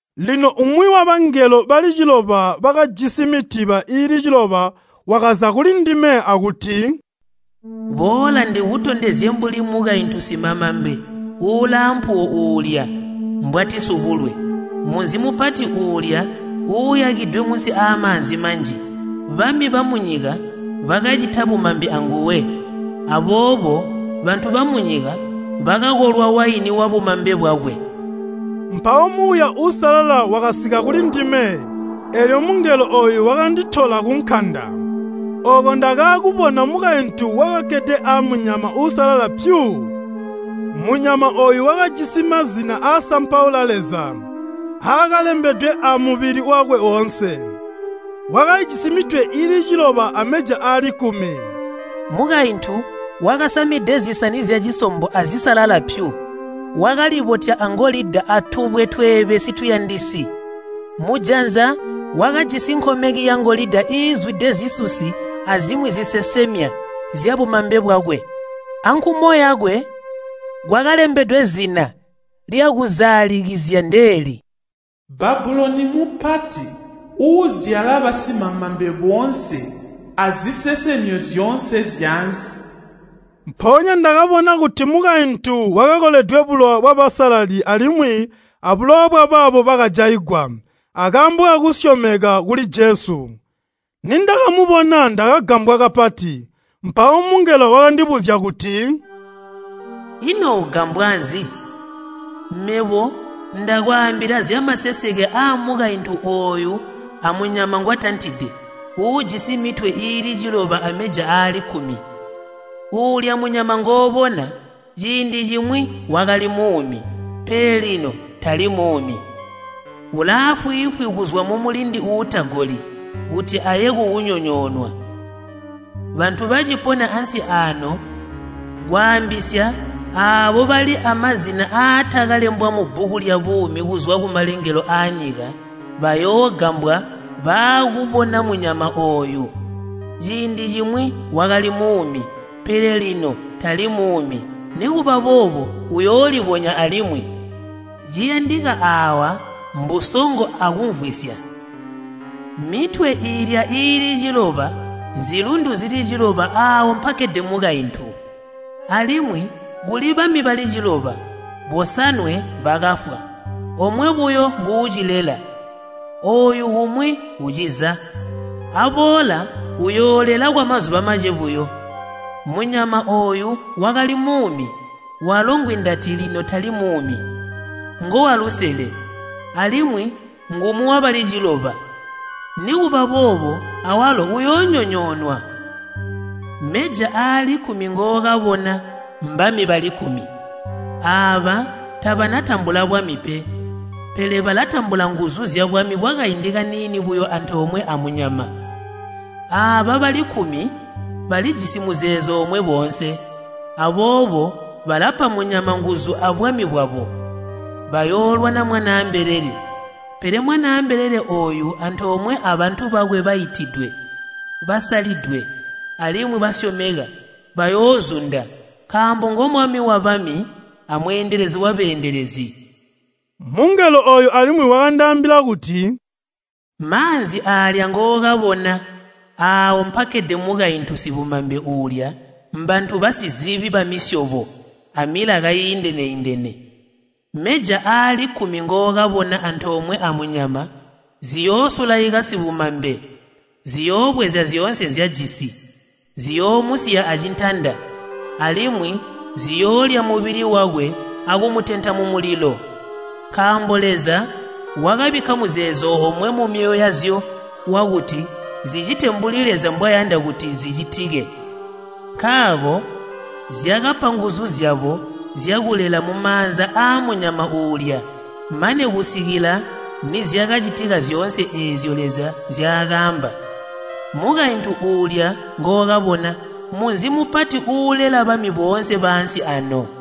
Lino umwi wabangelo bali ciloba bakajisi mitiba iili ciloba wakaza kulindime akuti, “Boola ndikutondezye mbuli mukaintu simamambe ulaampuwo uulya mbwatisubulwe, munzi mupati uulya uuyakidwe munsi aamaanzi manji. Bami bamunyika bakacita bumambe anguwe, aboobo bantu bamunyika bakakolwa waini wabumambe bwakwe.” Mpawo Muuya Uusalala wakasika kulindime, eelyo mungelo ooyu wakanditola kunkanda. Ooko ndakaakubona mukaintu wakakkede amunyama uusalala pyu. Munyama ooyu wakajisi mazina aasampaula Leza aakalembedwe amubili wakwe woonse. Wakalijisi mitwe iili ciloba ameja aali kkumi. Mukaintu wakasamide zisani zyacisombo azisalala pyu, wakalibotya angolida atubwe tweebesi tuyandisi. Mujanza wakajisi nkomeki yangolida iizwide zisusi azimwi zisesemya zyabumambe bwakwe. Ankumo yakwe kwakalembedwe zina lyakuzaalikizya ndeeli, “Babuloni mupati uuzyala basimamambe boonse azisesemyo zyoonse zyaansi.” Mpoonya ndakabona kuti mukaintu wakakoledwe bulowa bwabasalali alimwi abulowa bwabaabo bakajaigwa akaambo kakusyomeka kuli Jesu. Nindakamubona ndakagambwa kapati. Mpawo mungelo wakandibuzya kuti, “Ino ugambwa nzi? Mebo ndakwaambila zyamaseseke aamukaintu ooyu amunyama ngwatantide uujisi mitwe iili ciloba ameja aali kkumi. Uulya munyama ngoobona, ciindi cimwi wakali muumi, pele lino tali muumi. Ulaafwiifwi kuzwa mumulindi uutagoli kuti aye kukunyonyoonwa. Bantu bacipona ansi aano kwaambisya aabo bali amazina aatakalembwa mubbuku lyabuumi kuzwa kumalengelo aanyika, bayoogambwa baakubona munyama ooyu. Ciindi cimwi wakali muumi, pele lino tali muumi, nikuba boobo uyoolibonya alimwi. “Ciyandika aawa mbusongo akumvwisya. Mitwe iilya iili ciloba nzilundu zili ciloba aawo mpakkede mukaintu. Alimwi kuli bami bali ciloba, bosanwe bakafwa, omwe buyo nguucilela, ooyu umwi uciza, aboola uyoolela kwamazuba mace buyo. Munyama ooyu wakali muumi walo ngwindati lino tali muumi, ngowalusele, alimwi ngumwi wabali ciloba, nikuba boobo awalo uyoonyonyoonwa. “Meja aali kkumi ngookabona mbami bali kkumi. Aaba tabanatambula bwami pe, pele balatambula nguzu zyabwami kwakaindi kaniini buyo antoomwe amunyama. Aaba bali kkumi balijisi muzeezo omwe boonse, aboobo balapa munyama nguzu abwami bwabo. Bayoolwana Mwanaa mbelele, pele Mwanaa mbelele ooyu antoomwe abantu bakwe baitidwe, basalidwe, alimwi basyomeka bayoozunda, nkaambo ngo Mwami wabami a Mweendelezi wabeendelezi.” Mungelo ooyu alimwi wakandaambila kuti, “Maanzi aalya ngookabona, aawo mpakkede mukaintu sibumambe uulya mbantu bazisi, bamisyobo, amilaka iindene-indene. Meja aali kkumi ngookabona antomwe amunyama ziyoosulaika sibumambe. Ziyoobweza zyoonse nzyajisi, ziyoomusiya acintanda, alimwi ziyoolya mubili wakwe akumetenta mumulilo. Nkaambo Leza wakabikka muzeezo omwe mumyoyo yazyo wakuti zicite mbuli Leza mbwayanda kuti zicitike, nkaako zyakapa nguzu zyabo zyakulela mumaanza aamunyama uulya, mane kusikila nizyakacitika zyoone eezyo Leza nzyaakaamba. “Mukaintu uulya ngookabona munzi mupati uulela bami boonse baansi ano.”